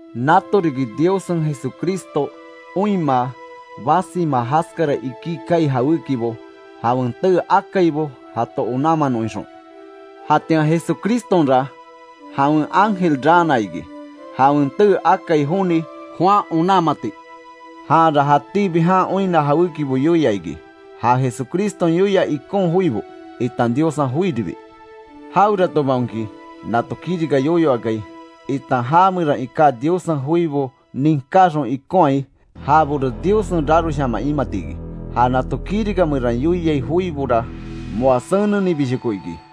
Nato riki Diossen Jesucristo oinmaa, basima jaskara ikí kaai jawékibo jawen tee akaibo jato onanmanon ixon. Jatian Jesucristonra jawen ángel raana iki; jawen tee akai joni Juan onanmati. Janra jatíbi jan oinna jawékibo yoia iki. Ja Jesucriston yoia ikon joibo, itan Diossen joiribi. Jaweratobaonki, nato kirika yoyo akai, itan ja meran iká Diossen joibo ninkaxon ikonhai, jabora Diossen raroshaman imati iki. Ja nato kirika meran yoiai joibora moa senennibishoko iki.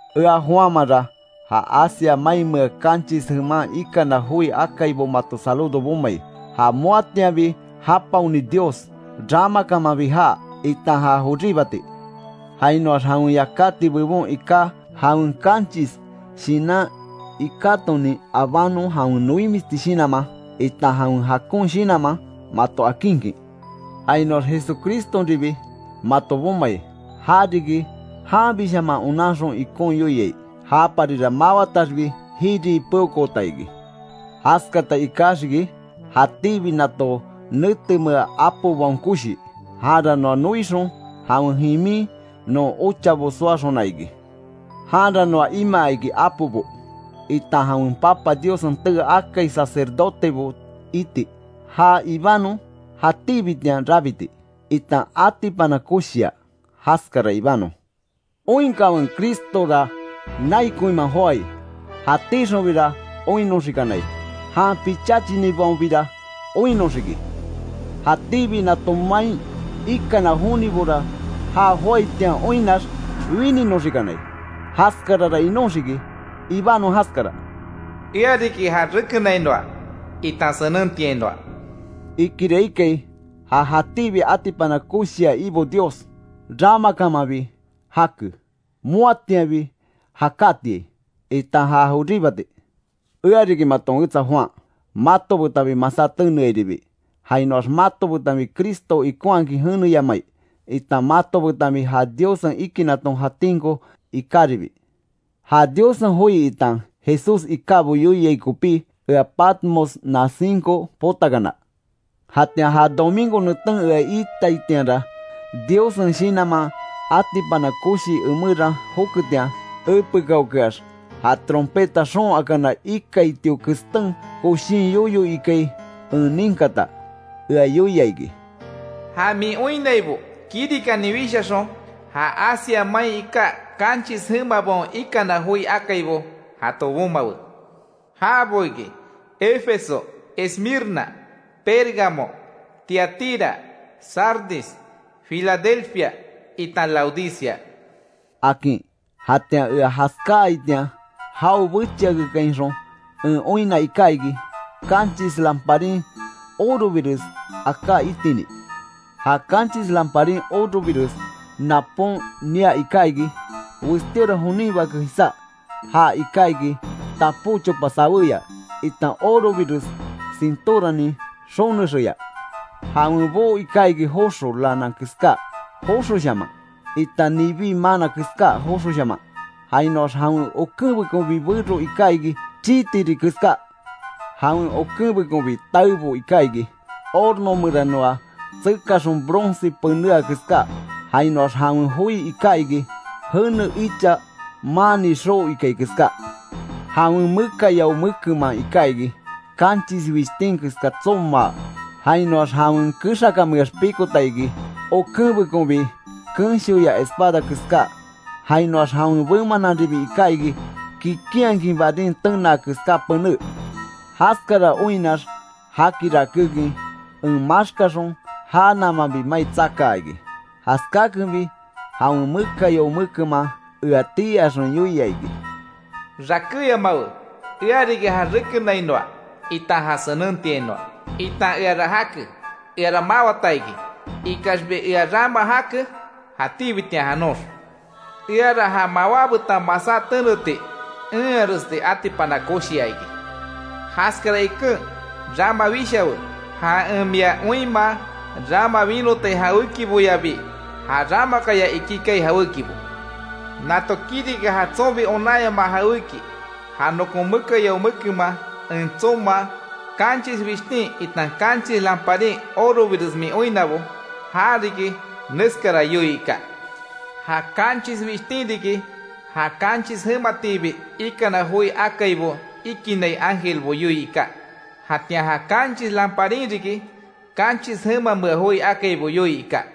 Ea Juanmanra, ja Asia mainmea kanchis jeman ikana joi akaibo mato saludo bomai. Ja moatianbi japaoni Dios; ramakamanbi jaa, itan ja joríbati. Jainoax jawen yakáti bebon iká jawen kanchis Shinan ikatonin abanon jawen noimisti shinanman, itan jawen jakon shinanman mato akinkin. Jainoax Jesucristonribi mato bomai, ja riki, janbishaman onanxon ikon yoiai. Japarira mawataxbi jirii peokoota iki. Jaskata ikaxiki jatíbi nato netemea apobaon koshi. Janra noa noixon jawen jimin non ochabo soaxona iki. Janra noa imaa iki apobo, itan jawen Papa Diossen tee akai sacerdotebo iti. Já ibanon jatíbitian rabiti, itan atipana koshia; jaskara ibanon. ¡Oinkanwe Cristora nai koinman joái!, Jatíxonbira oinnoxikanai; jan picháchinibaonbira oinnoxiki. Jatíbi nato main ikana jonibora já joaitian oinnax wininoxikanai. Jaskarara inóxiki. Ibanon jaskara. “Ea riki ja rekenainoa, itan senentiainoa”, ikira ikai, ja jatíbi atipana koshia Ibo Dios. Ramakamanbi jake, moatianbi jakátiai, itan ja joríbati. Ea riki maton wetsa Juan, mato betanbi masá teneairibi, jainoax mato betan Cristo ikonhakin jeneyamai, itan mato betanbi ja Diossen ikinaton jatinko ikáribi. Ja Diossen joi itan Jesús ikábo yoiai kopí, ea Patmos nasinko potakana. Jatian ja domingo neten ea iitaitianra, Diossen Shinanman atipana koshi emeran joketian; epekaokeax ja trompeta xoon akana ikaitio kestén koshin yoyo ikai en ninkata, ea yoia iki: “Ja min oinnaibo kirikanin wishaxon, ja Asia main iká kanchis jemabaon ikana joi akaibo jato bomawe. Jabo iki; Efeso, Esmirna, Pérgamo, Tiatira, Sardis, Filadelfia itan Laodicea”, akin. Jatian ea jaskáaitian jao bechiakekainxon en oinna iká iki, kanchis lamparin orobires aká itini. Ja kanchis lamparin orobires napon nia iká iki, westíora jonin Bake jisá, já iká iki tapó chopa saweya, itan orobires sintóranin xonexeya. Jawen boo iká iki joxo lana keska joxoshaman, itan nibí maana keská joxoshaman. Jainoax jawen okenbekonbi bero iká iki, chii tirí keska. Jawen okenbekonbi taebo iká iki, horno meranoa tsekaxon bronce penéa keská. Jainoax jawen joi iká iki, jene icha maanni xoo ikai keská. Jawen mekayao mekenman iká iki, kanchis wishtin keska tsomaa; jainoax jawen kexakanmeax pikota iki, okenbekonbi kenshoya espada keská. Jainoax jawen bemananribi iká iki, kikinhakin barín tenaa keská pené. Jaskara oinnax jaki rakékin en maxkaxon, já namanbi mai tsakaa iki. Jaskakenbi jawen mekayao mekenman ea tii axon yoia iki: “Rakéyamawe. Ea riki ja rekenainoa itan ja senentiainoa, itan eara jake. Eara mawata iki, ikaxbi ea rama jake jatíbitian janox. Eara ja mawá betan masá teneti enharesti atipana koshia iki. Jaskara iken rama wishawe, ja en mia oinmaa rama winotai jawékiboyabi, ja ramakaya ikí ikai jawékibo. Nato riki ja tsonbi onanyamaa jawéki ja nokon mekayao mekenman en tsomaa, kanchis wishtin itan kanchis lamparin orobires min oinnabo. Jariki neskara yoii iká: Ja kanchis wishtin riki, ja kanchis jematiibi ikana joi akaibo ikinai ángelbo yoii iká. Jatian ja kanchis lamparin riki, kanchis jemamea joi akaibo yoii iká.